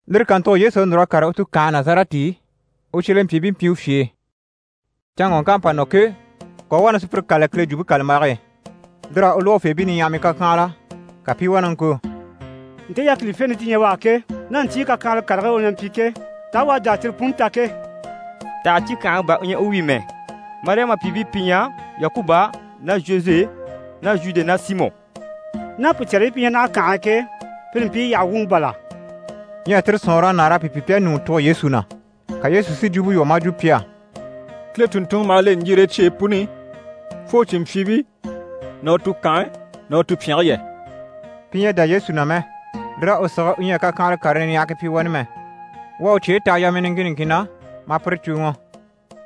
Lire kàntugo Yesu à núr'a kàre u tukanhe Nazarɛti i, u cyelempyiibii mpyi u fye e. Canŋɔŋk'à pa nɔ ke, ka u u wá na sùpyire kâlali Kile Jwumpe kàlambage e. Lir'à u lógofeebii niɲyahamii kàkyanhala, ka pi i wá na ŋko: «Nte yákilifente ti ɲyɛ u á ke, ná ɲcyii kakyanhala karigii u na mpyi ke, taa u à jà a cyire puni ta ke? Taha cíkyangaŋi bà u ɲyɛ u wi mɛ? Mariyama pyìibii pi ɲyɛ Yakuba ná Zhoze ná Zhude ná Simɔ ná pùcɛribii pi ɲyɛ naha kànhe e ke, pire mpii yyaha wuŋi bàl'à?» Ɲyɛ tire sɔ̀nŋɔr'à nâara a pi pyi pi a ɲùŋɔ tugo Yesu na. Ka Yesu si jwumpe lwɔ́ maa jwo pi á: «Kile tùnntunŋɔ maha le ɲjire e cyeyi puni i, fo u cìnmpyiibii ná u tukanhe ná u tupyɛnge yɛ.» Pi ɲyɛ a dá Yesu na mɛ, lir'à u sige u ɲyɛ a kakyanhala karii niɲyahagii pyi wani mɛ. U à u cyeyi taha yamii niŋkin niŋkin na, maa pire cùuŋɔ.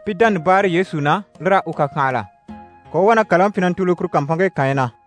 Pi dánabaare Yesu na, lir'à u kàkyanhala. Ka u u wá na kàlaŋi pyi na ntùuli kuru kàmpanŋke kànyi na.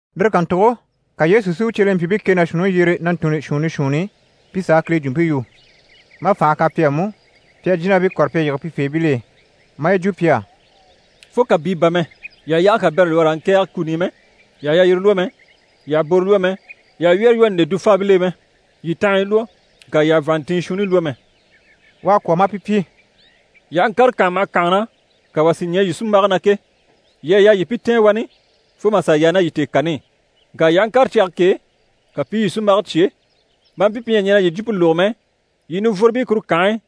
Lire kàntugo ka Yesu si u cyelempyiibii kɛ ná shuunniŋi yyere na ntunni shuunni shuunni pi sà a Kile jwumpe yu. Maa fànhe kan pi á mú, pi a jínabii kɔ̀re pi a yige pifeebil'e. Maa yi jwo pi á: «Fo kàbii bà mɛ, yii àha yaage kabɛrɛ lwɔ́ raa ŋkɛ̀ɛge kuni i mɛ, yii àha yalyire lwɔ́ mɛ, yii àha boro lwɔ́ mɛ, yii àha wyɛ́rɛ lwɔ́ nde dufaabil'e mɛ. Yii tanhanya lwɔ́, ŋka yii àha vàanntinɲyi shuunni lwɔ́ mɛ.» U à kwɔ̀ maa pi pyi: «Yii aha ŋkàre kànha maha kànha na, ka wà si ɲɛɛ yii sunmbage na ke, yii à yaa yii pi tɛ̀ɛn wani fo mà sà yaa ná yii tèekani i. Ŋka yii aha ŋkàre cyage k'e, ka pi i yii sunmbage cyé, maa mpyi pi ɲyɛ a ɲɛn'a yii jwumpe lógo mɛ, yii nivworobii kuru kànhe e,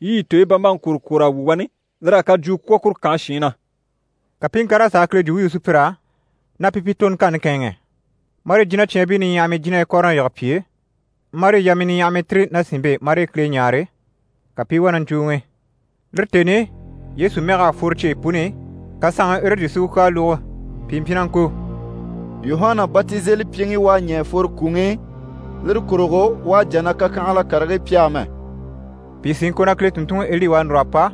yii yii tooyi bambaŋi kwòro kwòr'a wu wani, lir'à kajwuu kwɔ̀ kuru kànhe shiin na.» Ka pi i ŋkàr'a sà a Kile jwumpe yu sùpyir'á, na pi pi toroŋkanni kɛ̂ɛnŋɛ. Marii jínacyaanbii niɲyahamii jínahii kɔ̀re na yige pi e, marii yamii niɲyahamii tìri ná sìnmpe e marii Kile ɲáare, ka pi i wá na ɲcùuŋi. Lire tèni i, Yesu mɛg'à fworo cyeyi puni i, ka saanŋi Erɔdi si u kyaa lógo. Pìi mpyi na ŋko: «Yuhana Batizelipyiŋi u à ɲɛ̀ a fworo kwùŋi i, lire kurugo u à jà na kakyanhala karigii pyi amɛ.» Pìi sí i ŋko na Kile tùnntunŋiEli u à núr'a pa,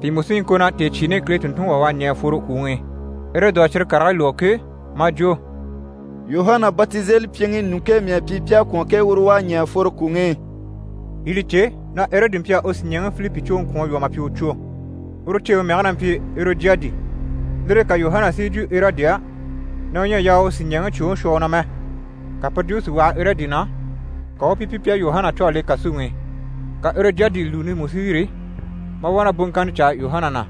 pìi mú sí i ŋko na tèecyiini Kile tùnntunŋi wà u à ɲɛ̀ a fworo kwùŋi i. Erɔdi à cyire karigii lógo ke, maa jwo: «Yuhana Batizelipyiŋi ɲùŋke mii à pyi pi à kwɔ̀n ke, uru u à ɲɛ̀ a fworo kwùŋi i.» Yii li cè na Erɔdi mpyi a u sìɲɛɛŋi Filipi cwoŋi kwɔ̀n a lwɔ́ mà pyi u cwo. Uru ceeŋi mɛge na mpyi Erɔdiyadi. Lire e ka Yuhana si yi jwo Erɔdi á na u ɲyɛ a yaa u u sìɲɛɛŋi cwoŋi shwɔ u na mɛ. Ka puru jwumpe si waha Erɔdi na, ka u u pi pyi pi à Yuhana cû a le kàsuŋi i. Ka Erɔdiyadi lùuni mú si yîri, maa wá na boŋkanni caa Yuhana na.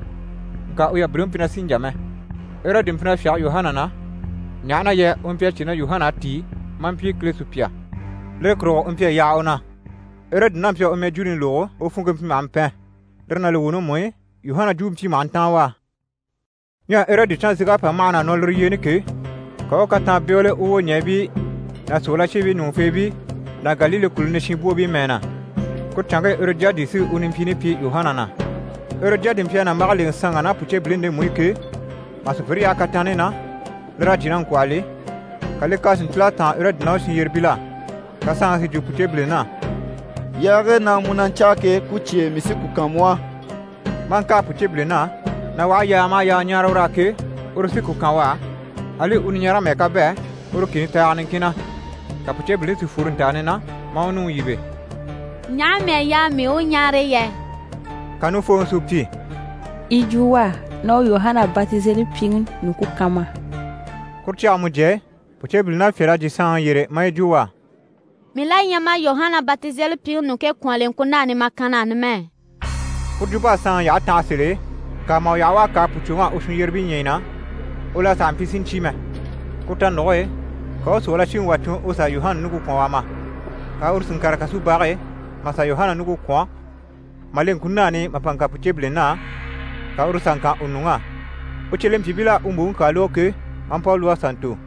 Ŋka u yabiliŋi mpyi na sì n‑jà mɛ. Erɔdi mpyi na fyáge Yuhana na, ɲaha na yɛ u mpyi a cè na Yuhana à tíi maa mpyi Kile sùpya. Lire kurugo u mpyi a yaha u na. Erɔdi n'a mpyi a u mɛjwuuni lógo, u funŋke mpyi maha mpɛn. Lire ná li wuuni mú i, Yuhana jwumpe mpyi maha ntáan u á. Ɲyɛ Erɔdi canzeg'à pa mâhana a nɔ lire yyeeni ke, ka u u kataan bégele u wwoɲɛɛbii ná sòrolashiibii ɲùŋufeebii ná Galile kùluni shinbwoobii mɛɛ na. Kuru canŋke Erɔdiyadi sí u nimpyiini pyi Yuhana na. Erɔdiyadi mpyi a nàmbage lèŋɛ saanŋ'á ná pùceebilini ndemu i ke, mà sùpyire yaha kataanni na, lir'à jyè na ŋkwɔ̂hɔli, ka li kyaa si ntíl'a táan Erɔdi ná u shinyyerebil'á. Ka saanŋi si jwo pùceebilin'á: «Yaage na mu na ɲcáa ke, ku cyêe, mii sí ku kan mu á.» Maa ŋkâa pùceebilin'á, na u aha yaaga maha yaaga ɲáare ur'á ke, uru sí ku kan u á, ali u niɲarege mɛ́ɛ k'à bɛ̂ uru kìni taaga niŋkin na. Ka pùceebilini si fworo ntàani na, maa u nuŋi yíbe: «Ɲaha mii à yaa mii u ɲáare yɛ?» Ka nufooŋi si u pyi: «Yi jwo u á na u Yuhana Batizelipyiŋi ɲùŋke kan ma á.» Kuru cyage mujye e, pùceebilin'à fyâl'a jyè saanŋi yyére maa yi jwo u á: «Mii la ɲyɛ mà Yuhana Batizelipyiŋi ɲùŋke kwɔ̀n a le ŋkunan'i mà kan na á numɛ.» Puru jwump'à saanŋi yyahe tanha sèl'e, ŋka mà u yaha u à kâa pùcwoŋ'á u shinyyerebii ɲyii na, u la sàha mpyi si ɲcyé mɛ. Kuru tanuge e, ka u u sòrolashiŋi wà tun u sà Yuhana ɲùŋke kwɔ̀n, u a ma. Ka uru si ŋkàre kasubage e mà sà Yuhana ɲùŋke kwɔ̀n, mà le ŋkunan'i mà pa ŋkan pùceebilin'á, ka uru sà ŋkan u nuŋ'á. U cyelempyiibil'à u mbòŋi kyaa lógo ke, maa mpa u lwɔ́ a sà ntò.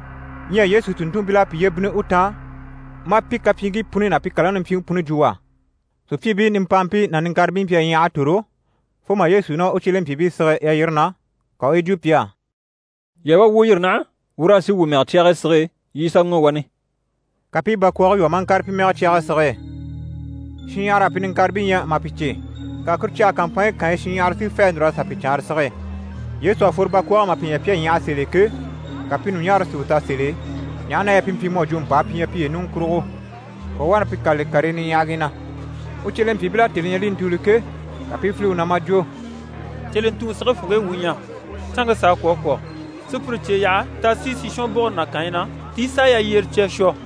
Ɲyɛ Yesu tùnntunmpil'à piye bínni u taan, maa pi kapyiiŋkii puni ná pi kàlaŋi nimpyiŋi puni jwo u á. Sùpyiibii nimpaampii ná niŋkaribii mpyi a ɲyaha a tòro, fo mà Yesu ná u cyelempyiibii sige yalyire na, ka u u yi jwo pi á: «Yii a wá wuu yîri naha, wuu raa sì wuu mɛge cyage sige e, yii i sà ŋɔ̀ wani.» Ka pi i bakwɔɔge lwɔ́ mà kàre pi mɛge cyage e sige e. Shinɲyahara à pi niŋkaribii ɲya mà pi cè. Ka kuru cyage kàmpanɲyi kànyi shinɲyahara si fê à núr'a sà pi caanra sige e. Yesu à fworo bakwɔɔge e mà pi ɲya pi à ɲyaha sèl'e ke, ka pi ɲùɲaare si u ta sèl'e, ɲaha na yɛ pi mpyi mu à jwo mpàa pi ɲyɛ piye ɲùŋɔ kurugo. Ka u u wá na pi kâlali karii niɲyahagii na. U cyelempyiibil'à tèni ɲya li i ntùuli ke, ka pi i file u na maa jwo: «Cyelentuŋi! Sige funŋke e wuu ɲyɛ, canŋke s'à kwɔ̀ a kwɔ̀. Sùpyire cye yaha t'a sì sishwɔnbugure ná kànyi na, ti sà yalyire cya a shwɔ.»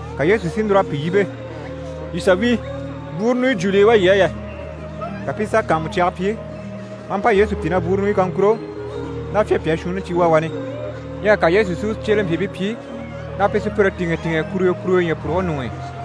Ka Yesu si núr'a pi yíbe: «Yii sà wíi! Bwúuru ɲùɲyi jùuli yi wá yii á yɛ?» Ka pi i sà kàanmucyaga pyi, maa mpa Yesu pyi na bwúuru ɲùnyɔ kaŋkuro ná fyapyaa shuunni yi wá wani. Ɲyɛ ka Yesu si u cyelempyiibii pyi na pi sùpyire tìŋɛ tìŋɛ, kuruyo kuruyo ɲyɛ̀puruge ɲuŋ'i.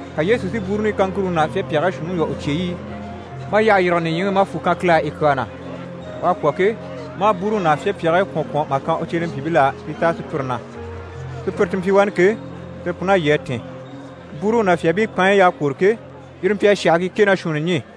Ka Yesu si bwúuru ɲùɲyi kaŋkuruŋi ná fyapyaagii shuunniŋi lwɔ́ u cyeyi i, maa yyahe yîrige nìɲyiŋi i maa fwù kan Kile á yi kyaa na. U à kwɔ̀ ke, maa bwúuruŋi ná fyapyaagii kwɔ̀n kwɔ̀n mà kan u cyelempyiibil'á pi à táa sùpyire na. Sùpyire ti mpyi wani ke, tire pun'à lyî a tìn. Bwúuruŋi ná fyaabii paanyi y'à kwôro ke, yire mpyi a shàhii kɛ ná shuunni ɲî.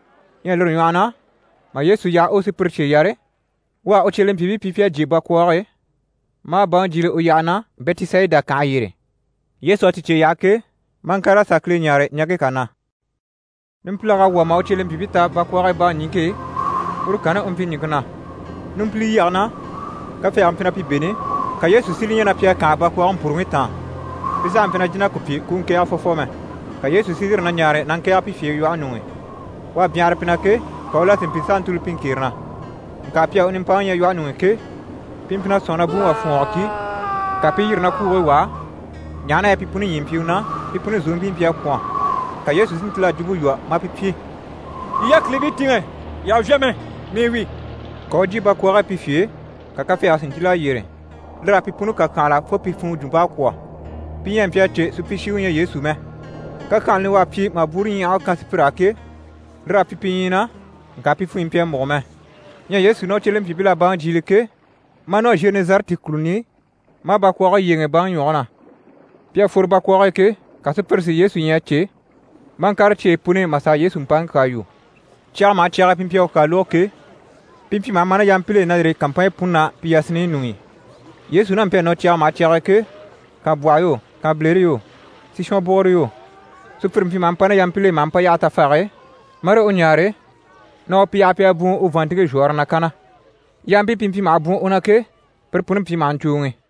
Ɲyɛ lire ɲwɔhɔ na, mà Yesu yaha u u sùpyire cye yare, u à u cyelempyiibii pyi pi à jyè bakwɔɔge e, maa baŋi jyiile u yyaha na, Bɛtisayida kànhe yyére. Yesu à ti cye yaha ke, maa ŋkàr'a sà Kile ɲáare ɲaŋke kà na. Numpilag'à wwɔ̀ mà u cyelempyiibii ta bakwɔɔge e baŋi niŋke e, uru kanni u mpyi ɲìŋke na. Numpilyage na, kafɛɛge mpyi na pi bêni, ka Yesu si li ɲya na pi à kànha bakwɔɔge mpuruŋi taan. Pi sàha mpyi na jìn'a ku pyi ku u ŋkɛ̀ɛge fwɔfwɔ mɛ. Ka Yesu si yîri na ɲaare na ŋkɛ̀ɛge pi fye e lwɔhe ɲuŋ'i. U à byanhara pi na ke, ka u la si mpyi s'a ntùuli pi ŋkere na. Ŋka pi à u nimpaŋi ɲya lwɔhe ɲuŋ'i ke, pi mpyi na sɔ̂nŋi na buŋi wà fwɔ̀ɔngɔ ki, ka pi i yîri na kwuugii wàa, ɲaha na yɛ pi puni ɲyii mpyi u na, pi puni zòompii mpyi a kwɔ̀n. Ka Yesu si ntíl'a jwumpe lwɔ́ maa pi pyi: «Yii yákilibii tìŋɛ, yii àha vyá mɛ, mii wi.» Ka u u jyè bakwɔɔge e pi fye e, ka kafɛɛge si ntíl'a yyére. Lir'à pi puni kàkyanhala fo pi funŋɔ jwump'à kwɔ̀. Pi ɲyɛ a mpyi a cè supyishiŋi u ɲyɛ Yesu mɛ. Kakyanhani u à pyi mà bwúuruɲyahage kan sùpyir'á ke, lir'à pyi pi ɲyii na, ŋka pi funɲyi mpyi a múgo mɛ. Ɲyɛ Yesu ná u cyelempyiibil'à baŋi jyiile ke, maa nɔ Zhenɛzarɛti kùluni i, maa bakwɔɔge yyéeŋɛ baŋi ɲwɔge na. Pi à fworo bakwɔɔge e ke, ka sùpyire si Yesu ɲya a cè, maa ŋkàre cyeyi puni i mà sà a Yesu mpaŋi kyaa yu. Cyaga maha cyag'e pi mpyi a u kyaa lógo ke, pi mpyi maha ma ná yampil'e na yîri kàmpanɲyi puni na, pi yasinniɲyi ɲuŋ'i. Yesu n'a mpyi a nɔ cyaga maha cyag'e ke, kànbwɔhɔ yo, kànbilere yo, sishwɔn bùguro yo, sùpyire mpyi maha mpa ná yampil'e maha mpa yaha tafage e, marii u ɲáare na u pi yaha pi a bwùun u vàanntinŋke zhwɔ̀ɔre na kanna. Yampii pi mpyi maha bwùun u na ke, pire puni mpyi maha ɲcùuŋi.